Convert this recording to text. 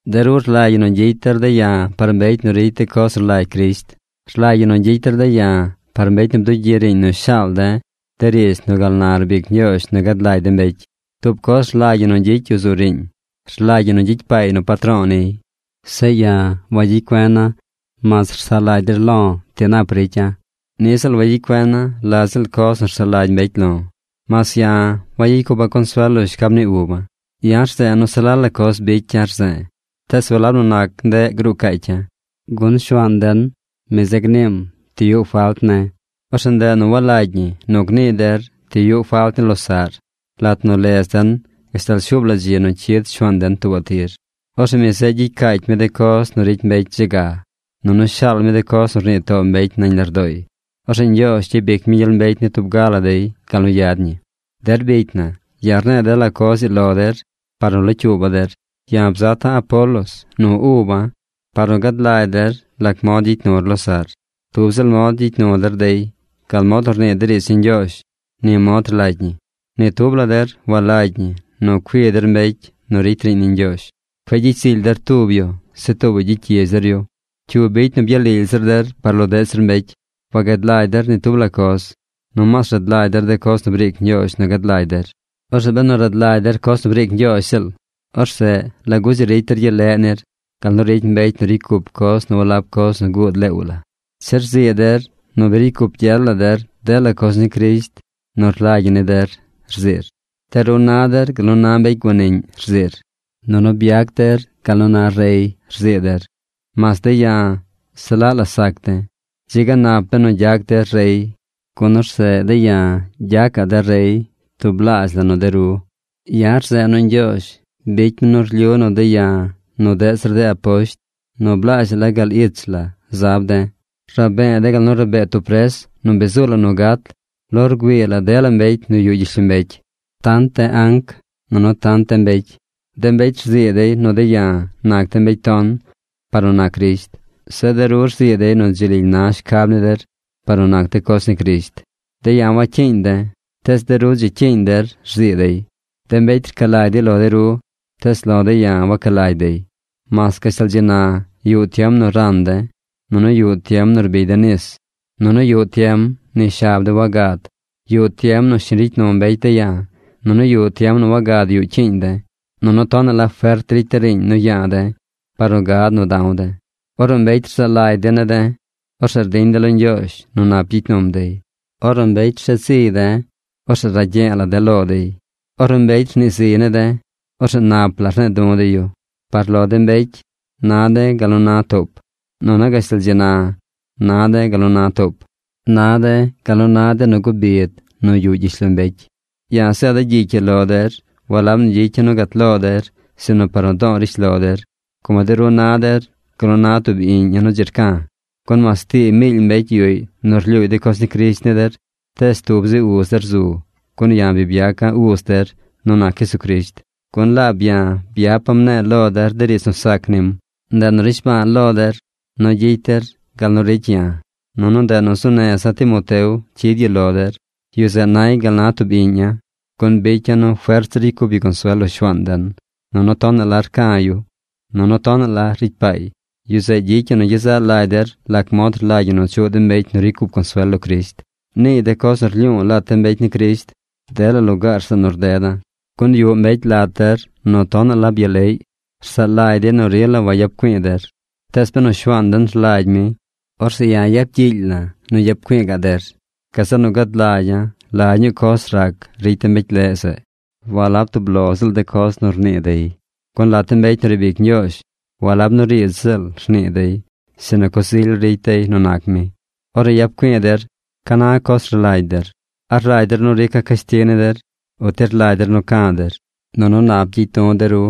De ru rlagy ñi nu gyicy der de̱ ya̱ par mbecy nu ricy de coz nu rlagy Crisht. Rlagy ñi nu gyicy der de̱ ya̱ par mbecy nu bdugyi riiñ nu shaal de̱ de riidz nu gal na rbic Ñgyoozh nu gad lagy de mbecy. Tub coz rlagy ñi nu gyicy yu zu riiñ. Rlagy ñi nu gyicy paay nu patro̱o̱ niy. Zeꞌ ya̱ wagyicy cuena̱ mas rsaꞌ lagy der lo̱ ti nap ricya̱. Niꞌ ziꞌl wagyicy cuena̱ la ziꞌl coz nu rsaꞌ lagy mbecy lo̱. Mas ya̱, wagyicy cupa̱ consuel lo shcab ni uba̱. Ya̱ rze̱e̱ nu se la la coz bicya̱ rze̱e̱, tees walab nu nac ndeꞌ gruu caacya̱, gun Shuaan den, mi zeꞌ gniim ti yuꞌ falt ne̱. Orzeꞌ ndeꞌ nu walagy ñi nu gnii der ti yuꞌ falt ni losaꞌr, lat nu lez den gashtal shuub la dzi nu cyid Shuaan den tuubaꞌ tir. Orzeꞌ mi zeꞌ gyicy caacy mi de coz nu ricy mbecy dze ga. Nunu shaal mi de coz nu rnii too mbecy nañ lardooy. Orzeꞌ Ñgyoozh gyabic mi gyel mbecy ni tub ga la dey gal nu yad ñi. Der bicy na, ya̱ rne̱e̱ dela coz ii lo der par nu locyuuba̱ der. Ya̱ bzata̱ Apolos nu uba̱ par nu gad lagy der lac mod gyicy nur losaꞌr. Tub ziꞌl mod nu gyicy nu der dey. Gal mod nu rnii de riidz ni Ñgyoozh, ni mod rlagy ñi. Ni tub la der walagy ñi nu cui der mbecy nu ricy riiñ ni Ñgyoozh. Cueꞌ gyicy zily der tub yu. Zeꞌ tuubaꞌy gyicy gyidz der yu. ¿Cyu bicy nu byalily zir der par lo deꞌ zir mbecy? Wagad lagy der ni tub la coz. Nomaas rad lagy der de coz nu briic Ñgyoozh nu gad lagy der. Orzeꞌ benu rad lagy der coz nu briic Ñgyoozh ziꞌl, orzeꞌ ¿lagu dzi ricy der gyel leꞌ nir gal nu ricy mbecy nu ricy cup coz nu walab coz nu guud leew la? Che rzii der nu bi ricy cup gyel la der dela coz ni Crisht nu rlagy ñi ni der, rziir. De ru na der gal nu na mbecy guaniꞌñ, rziir. Nunu byac der gal nu na rey, rzii der, mas de̱ ya̱ se laꞌ la sac de̱. Dzi ga nap benu gyac der rey, gun orzeꞌ de̱ ya̱ gyacaꞌ de̱ rey tublaazh la nu de ru. Ya̱ rze̱e̱ nu Ñgyoozh bicy mi nu rlyu nu de̱ ya̱ nu deꞌ zir de aposht nu blaazh la gal ich la zab de̱. Rabee de̱ gal nu rabee tub pres nu bi zuu la nu gat lo rgüii la dela mbecy nu yuꞌ gyishlombecy: tant de anc nunu tant de mbecy. De mbecy rzii dey nu de̱ ya̱ nac de̱ mbecy ton par nu nac Crisht. Zeꞌ de ru rzii dey nu dzi lily na shcab ni der par de coz ni Crisht. De̱ ya̱ wacyiiñ de̱, tees de ru dzi cyiiñ der rzii dey. De mbecy rca lagy dey lo de ru, tees lo de̱ ya̱ waca lagy dey. Mas gashtal dzi na yuꞌ tiem nu ran de̱, nunu yuꞌ tiem nu rbigy de̱ nis, nunu yuꞌ tiem ni shab de̱ wagad. Yuꞌ tiem nu shiñ ricy nu mbecy de̱ ya̱. Nunu yuꞌ tiem nu wagad yuꞌ cyiiñ de̱. Nunu tonaꞌ la fert ricy de̱ riiñ nu ya̱a̱ de̱ par nu gad nu da̱w de̱. Ornu mbecy rzaa lagy dey ne̱ de̱, orzeꞌ rdiñ de̱ lo Ñgyoozh nu nap gyicy num dey. Ornu mbecy rsheed ziy de̱, orzeꞌ ragye̱e̱ la̱ de̱ lo dey. Ornu mbecy rnii ziy ne̱ de̱, orzeꞌ nap la rne̱e̱ du̱ de̱ yu. Par lo de mbecy na de̱ gal nu na toop. Nunu gashtal dzi na, na de̱ gal nu na toop. Na de̱ gal nu na de nu guꞌ bid nu yuꞌ gyishlombecy. Ya̱ zeeda̱ gyicy ii lo der walab nu gyicya̱ nu gat lo der, sinu par nu do̱o̱ rishlo der, como de ru na der gal nu na tub iꞌñ ya̱ nu dzi rca̱. Gun mas tii miily mbecy yuꞌy nu rlyuuy de coz ni Crisht ni der, tees tub zi uz der zu, gun ya̱ byaca̱ uz der nu nac Jesucrisht, gun laab ya̱ byapa̱ mne̱e̱ lo der de riidz nu sac nim. Ndeꞌ nu rnishba̱a̱ lo der nu gyicy der gal nu ricy ya̱. Nunu ndeꞌ nu zuu neza̱ Timoteo cyid yu lo der. Yu zeꞌ nay gal na tub iꞌñ ya̱, gun bicya̱ nu fert zir ricy cup yu consuel lo Shuaan den. Nunu tonaꞌ la rca̱ yu. Nunu tonaꞌ la la ricy paay. Yu zeꞌ gyicy yu nu gyezaꞌ lagy der lac mod rlagy ñi nu chuꞌ de mbecy nu ricy cup consuel lo Crisht. Niiy de coz nu rlyu̱u̱ lat de mbecy ni Crisht dela lugaar zeꞌ nu rdeda̱. Gun yuꞌ mbecy lat der nu tonaꞌ la byaleꞌy. Rsaꞌ lagy dey nu rila wayap güi̱i̱ der. Tees benu Shuaan den rlagy mi, orzeꞌ ya̱ yap gyiily la̱ nu yap güi̱i̱ ga̱ꞌ der. Gazeꞌ nu gad lagya̱ la ñuu coz rac ricy de mbecy leꞌ zeꞌ. Walab tub lo ziꞌl de coz nu rnii dey. Gun lat de mbecy nu riib ic Ñgyoozh, walab nu riidz ziꞌl rnii dey, sinu coz ily ricy dey nu nac mi. Ornu yap güi̱i̱ der, ¿ca na coz rlagy der? ¿A rlagy der nu rica̱ cashtig ni der, uti rlagy der nu ca̱ der, nunu nap gyicy du̱ der?